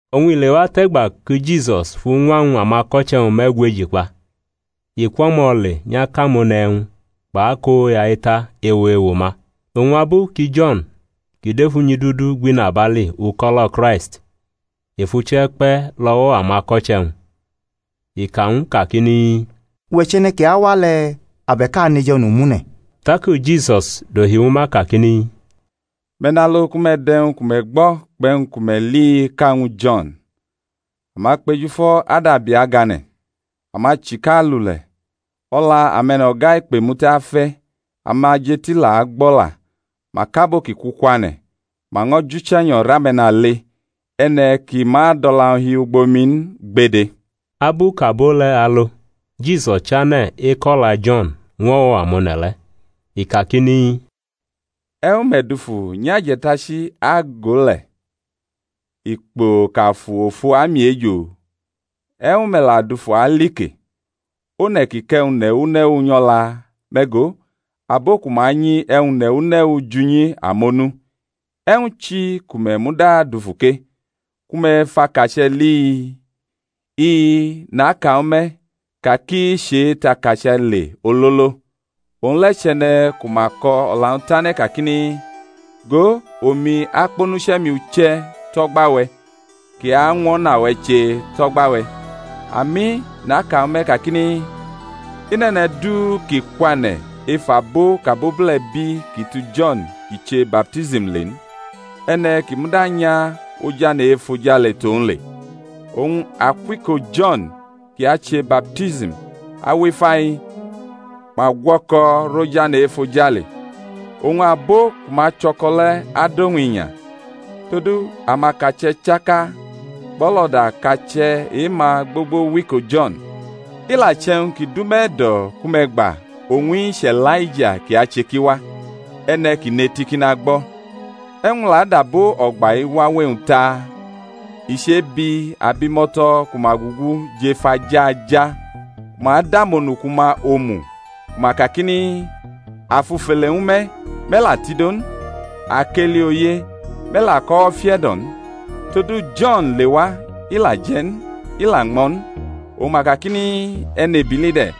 Oñ i lewatʼe̩gba ki Jisus fuñwa ñw amako̩che̩-wñ me̩gweji kpa, i kwʼo̩mo̩ le nyʼakʼamone̩ e̩wñ kpʼakoya eta ewo ewo-ma. Oñ abu ki Jo̩n kʼi dʼef unyidudu gbʼinabali uko̩lo̩ Kraisti, i fʼuche̩ kpe̩ lʼo̩wo̩ amako̩che̩-wñ. I ka ñw u kakini, Uwe̩ chʼe̩ne̩ kʼi awa le̩? abe̩k a aneju e̩nomune̩? Taki Jisus dohi ñwu ma kakini, Me̩ nalo ku me̩ dʼe̩wñ ku me̩ gbo̩ kpʼe̩wñ ku me̩ li-i ka ñwu Jo̩n; amakpejufo̩ adabi agane̩, amachika alule̩, o̩la ame̩no̩ga ikpemute afe̩, amajeti la agbo̩la, ma kʼabo ki ku kwane̩, ma ño̩ jʼUche̩nyo̩ rʼame̩nale. E̩ne̩ kʼi ma dʼo̩la-wñ hi ugbo mi n gbede. Abu kʼabo le̩ alo Jisus chane̩ ekʼo̩la Jo̩n ñw o̩wo̩ amone̩ le̩. I kakini, E̩wñ me̩ dufu nyʼaje̩tachi ago le̩? Ikpo kʼafu ofo amiejo? E̩wñ me̩ la dufu alike? One̩ kʼi kʼe̩wñ ne̩wu ne̩wu nyʼo̩la? Me̩ go, abo ku ma anyi e̩wñ ne̩wu ne̩wu jʼunyi amonu. E̩wñ chi ku me̩ muda dufu ke? ku me̩ fʼakache̩ li? I-i, naka ñwu me̩, ka kʼi chetʼakache̩ le ololo. Owñ le̩ chʼe̩ne̩ ku ma ko̩ o̩la-wñ tane̩ kakini, Go, omi akpʼonuche̩-mi uche̩ tʼo̩gba-we̩, kʼi añwʼo̩na-we̩ che tʼo̩gba-we̩. Ami, naka ñwu me̩ kakini, I nʼe̩ne̩ du kʼi kwane̩ ef abo kʼabobule̩ bi kʼi tu Jo̩n kʼi che baptism le n. E̩ne̩ kʼi muda nya ojane̩ e-efojale tʼowñ le. Oñ akwʼiko Jo̩n kʼi ache baptism awʼifa-i ma gwo̩ko̩rʼojane̩ e-efojale, oñ abo ku ma cho̩ko̩ le̩ adʼowñ inya. Todu amakache̩ chaka kpʼo̩lo̩da kache̩ e-ma gbogbo wʼiko Jo̩n; i la che̩wñ ki dʼume̩ e̩do̩ ku me̩ gba, owñ-i chʼE̩laija kʼi ache kʼi wa. E̩ne̩ kʼi nʼeti kʼi nagbo̩. E̩wñ u la adʼabo o̩gba-i wawe-wñ ta? I chebi abimo̩to̩ ku ma gugu jʼef aja aja ku ma dʼamonuku-ma omu, ku ma kakini, A fʼufele ñwu me̩, me̩ la tido n; a kʼeli oye, me̩ la kʼo̩wo̩ fiʼe̩do̩ n. Todu, Jo̩n lewa, i la je̩ n, i la ñmo̩ n, oñ ma kakini, E̩nebili de̩.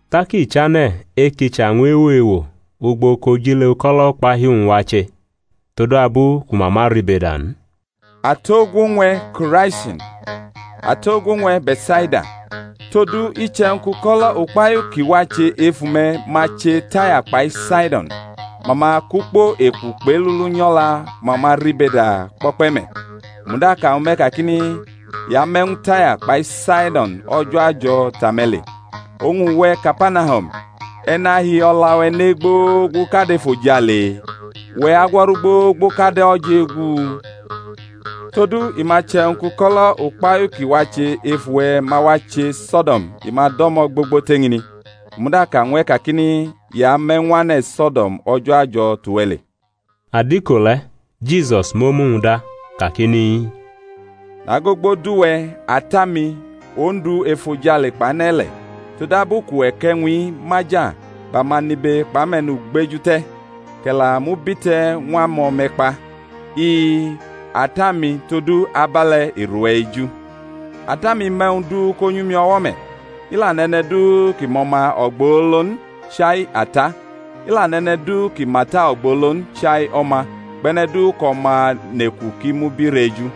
Tak i chane̩ ekicha ñw ewo ewo ugbo kʼojile uko̩lo̩ ukpahiu-wñ wache, todabu ku ma ma ribeda n. Atogwo ñw e̩, Ko̩raisin! Atogwo ñw e̩, Be̩tsaida! Todu, iche̩wñ kʼuko̩lo̩ ukpahiu kʼi wache ef ume̩ ma che Taya kpai Saido̩n, ma ma kʼukpo eku kpʼelulu nyʼo̩la ku ma ma ribeda kpo̩kpe̩ me̩. U muda ka ñwu me̩ kakini, I ame̩ ñwu Taya kpai Saido̩n o̩jo̩ ajo̩ tʼame̩ le. Oñ uwe̩, Kapanahum, e̩ ñʼahi o̩la-we̩ ne gbogbo kad efojale? Uwe̩ agwo̩ru gbogbo kad o̩jegu: todu i ma che̩wñ kʼuko̩lo̩ ukpahiu kʼi wache ef uwe̩ ma wache So̩do̩m, i ma do̩mo̩ gbogbo tʼeñini. U muda ka ñw e̩ kakini, I ame̩ ñw ane̩ So̩do̩m o̩jo̩ ajo̩ tʼuwe̩ le. Adiko le̩ Jisus mʼomu-wñ da kakini, Nagogbodʼuwe̩, Ata-mi, Ondu efojale kpʼane̩-ile̩, todabu kʼuwe̩ kʼe̩wñ-i maja bʼamanibe kpʼame̩nugbeju te̩, kʼe̩ la mʼu bite̩ ñw amo̩me̩kpa. I-i, Ata-mi, todu abe̩le̩ i rʼuwe̩ eju. Ata-mi mʼe̩wñ du ko nyʼumi o̩wo̩ me̩. I la nʼe̩ne̩ du kʼi mʼO̩ma ogbolo n, chai Ata; i la nʼe̩ne̩ du kʼi mʼAta ogbolo n chai O̩ma, kpʼe̩ne̩ du kʼO̩ma neku kʼi mʼu birʼeju.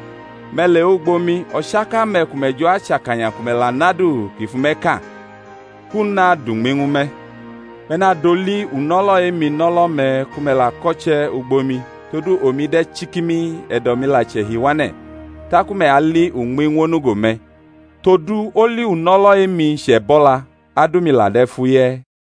Me̩ lewʼugbo mi, o̩chaka-me̩ ku me̩ jo̩ achʼakanya, ku me̩ la nʼadu ki fʼume̩ ka, kʼu nadʼuñmi ñwu me̩. Me̩ nadʼoli uno̩lo̩ e-mi nʼo̩lo̩-me̩ ku me̩ la ko̩che̩ ugbo mi, todu omi de̩ chikimi, e̩do̩-mi la chʼe̩hi wane̩, taku me̩ ali uñmi ñw onugo-me̩. Todu oli uno̩lo̩ e-mi chʼe̩bo̩la, adumi la de̩ fuye̩.